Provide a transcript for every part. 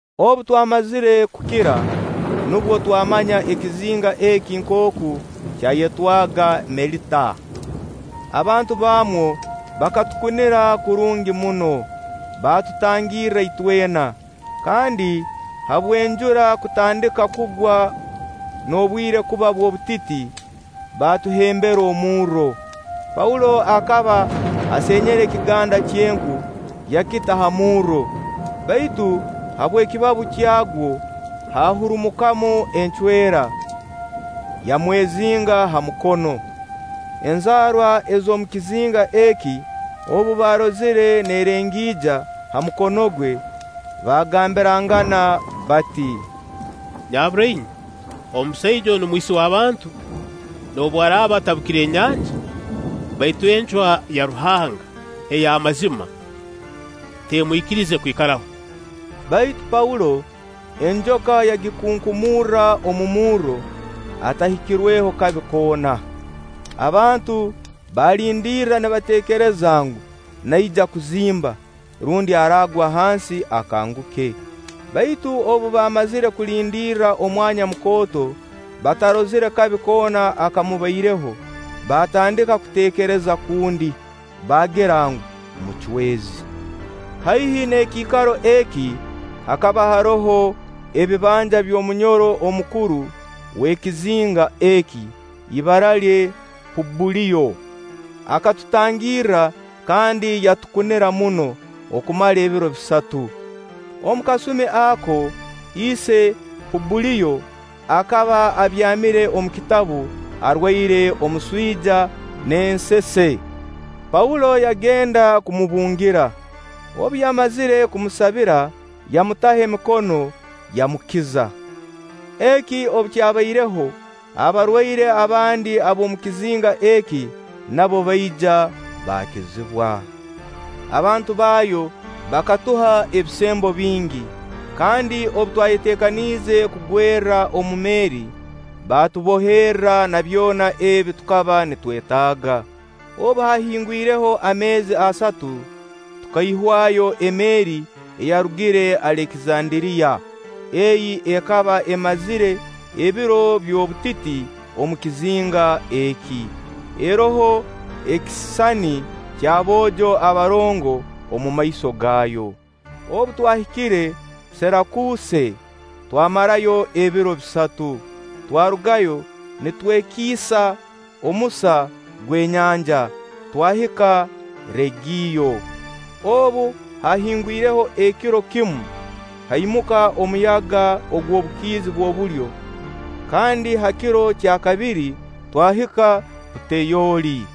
Obu twamazire kukira, nubwo twamanya ekizinga eki nkooku kyayetwaga Melita. Abantu baamwo bakatukunira kurungi muno. Baatutangirra itwena, kandi habw'enjura kutandika kugwa n'obwire kuba bw'obutiti, baatuhembera omurro. Paulo akaba asenyere ekiganda ky'enku, yakita ha murro; baitu habw'ekibabu kyagwo, hahurumukamu encwera, yamwezinga ha mukono. Enzaarwa ez'omu kizinga eki obu baarozire nerengiija ha mukono gwe, baagambirangana bati: “Nyabura inywe omusaija onu mwisi w'abantu. Noobu araaba atabukire enyanja, baitu encwa ya Ruhanga ey'amazima temwikirize kwikaraho.” Baitu Paulo, enjoka yagikunkumurra omu murro atahikirweho kabi koona. Abantu baalindirra nibateekereza ngu, naija kuzimba rundi aragwa hansi akanguke; baitu obu baamazire kulindirra omwanya mukooto, batarozire kabi koona akamubaireho, baatandika kuteekereza kundi, baagira ngu, mucwezi. Haihi n'ekiikaro eki, hakaba haroho ebibanja by'omunyoro omukuru w'ekizinga eki, ibara lye Pubuliyo. Akatutangirra kandi yatukunira muno okumara ebiro bisatu. Omu kasumi ako, ise Pubuliyo akaba abyamire omu kitabu, arwaire omuswija n'ensese. Paulo yagenda kumubungira. Obu yamazire kumusabira, yamutaho emikono, yamukiza. Eki obu kyabaireho, abarwaire abandi ab'omu kizinga eki nabo baija baakizibwa. Abantu baayo bakatuha ebisembo bingi, kandi obu twayeteekaniize kugwerra omu meeri, baatuboherra na byona ebi tukaba nitwetaaga. Obu haahingwireho ameezi asatu, tukaihwayo emeeri eyarugire Alekizanderiya ei ekaba emazire ebiro by'obutiti omu kizinga eki, eroho ekisisani ky'Aboojo Abarongo omumaiso gaayo. Obu twahikire Sirakuuse, twamarayo ebiro bisatu. Twarugayo nitwekiisa omusa gw'enyanja, twahika Reegiyo. Obu haahingwireho ekiro kimu, haimuka omuyaga ogw'obukiizi bw'obulyo, kandi ha kiro kya kabiri twahika Puteyoli,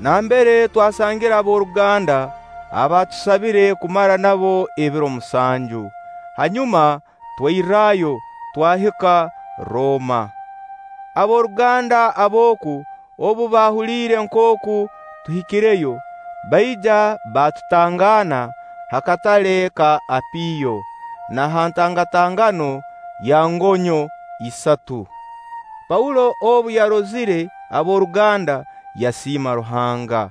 nambere twasangire ab'oruganda abaatusabire kumara nabo ebiro musanju. Hanyuma twairrayo, twahika Rooma. Ab'oruganda ab'oku obu baahuliire nkooku tuhikireyo, baija baatutangaana ha Katale ka Apio na ha ntangatangano ya Ngonyo Isatu. Paulo obu yarozire ab'oruganda yasiima Ruhanga,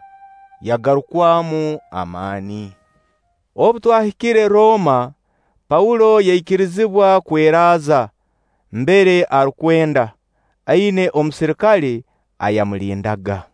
yagarukwamu amaani. Obu twahikire Rooma, Paulo yaikirizibwa kweraaza mbere arukwenda, aina omuserikale ayamulindaga.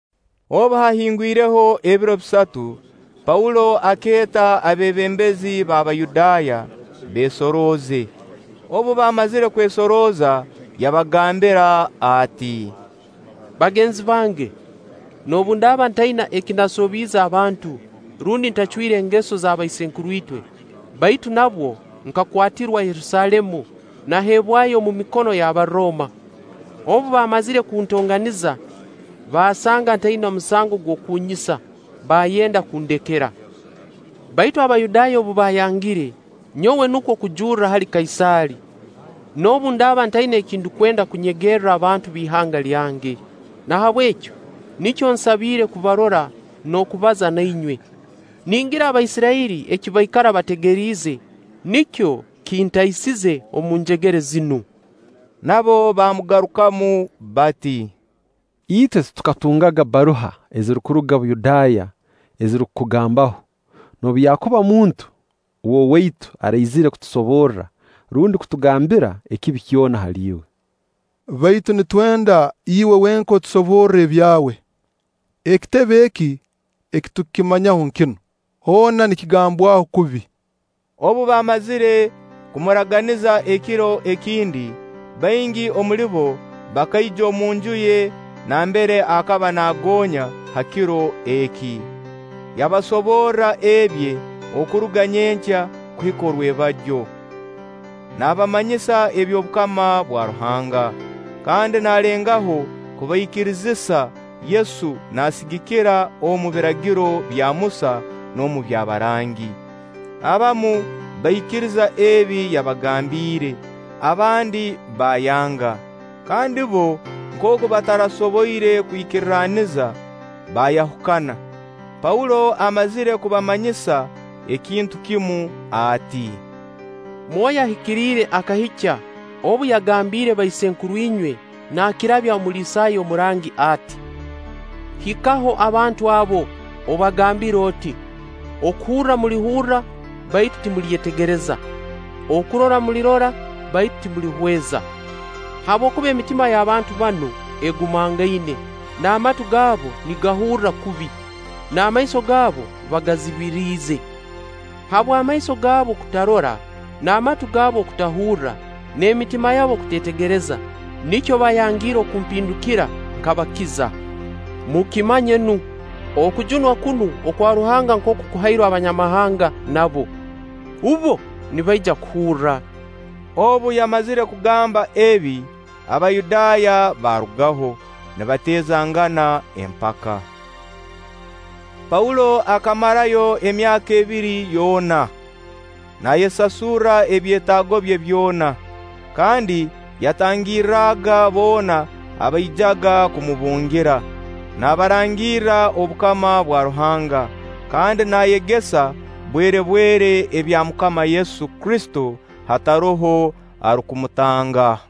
Obu haahingwireho ebiro bisatu, Paulo akeeta abeebembezi b'Abayudaaya, beesorooze. Obu baamazire kwesorooza yabagambira ati: “Bagenzi bange, noobu ndaaba ntaina eki nasobiize abantu rundi ntacwire engeso z'abaisenkuru itwe, baitu nabwo nkakwatirwa Yerusaalemu naaheebwayo omu mikono y'Abarooma. Obu baamazire kuntonganiza, baasanga ntaina musango gw'okunnyisa, baayenda kundekera. Baitu Abayudaaya obu baayangire, nyowe nukwo kujurra hali Kaisaali, noobu ndaaba ntaina eki ndukwenda kunyegerra abantu ab'ihanga lyange. Nahabweki nikyo nsabiire kubarora n'okubaza na inywe. Ningira Abaisirairi eki baikara bategeriize, nikyo kintaisize omu njegere zinu.” Nabo baamugarukamu bati: “Itwe titukatungaga bbaruha ezirukuruga Buyudaaya ezirukukugambaho, noobu yakuba omuntu w'owaitu araizire kutusoborra rundi kutugambira ekibi kyona hali iwe. Baitu nitwenda iwe wenka otusoborre ebyawe. Ekitebe eki, eki tukimanyaho nkinu: hoona nikigambwaho kubi.” Obu baamazire kumuraganiza ekiro ekindi, baingi omuli bo bakaija omunju ye nambere akaba naagoonya ha kiro eki. Yabasoborra ebye okuruga nyenkya kuhika rwebagyo, naabamanyisa eby'obukama bwa Ruhanga, kandi naalengaho kubaikirizisa Yesu naasigikira omu Biragiro bya Musa n'omu by'abarangi. Abamu bakaikiriza ebi yabagambiire, abandi baayanga. Kandi bbo nkooku batarasoboire kwikirraniza, baayahukana, Paulo amazire kubamanyisa ekintu kimu ati: “Mwoyo Ahikiriire akahikya obu yagambiire baisenkuru inywe naakirabya omu Isaaya omurangi ati: ‘Hikaho abantu abo, obagambire oti: Okuhurra mulihurra, baitu timulyetegereza; okurora mulirora, baitu timulihweza. Habwokuba emitima y'abantu banu egumangaine, n'amatu gaabo nigahurra kubi, n'amaiso gaabo bagazibiriize. Habw'amaiso gaabo okutarora, n'amatu gaabo okutahurra, n'emitima yabo okuteetegereza nikyo baayangiire okumpindukira nkabakiza.’ Mukimanye nu, okujunwa kunu okwa Ruhanga nkooku kuhairwe Abanyamahanga nabo. Bbo nibaija kuhurra.” [ Obu yamazire kugamba ebi, Abayudaaya baarugaho, nibateezangana empaka.] Paulo akamarayo emyaka ebiri yoona, naayesasurra ebyetaago bye byona, kandi yatangirraga boona abaijaga kumubungira, naabarangirra obukama bwa Ruhanga kandi naayegesa bwerebwere ebya MUKAMA Yesu Kristo hataroho arukumutanga.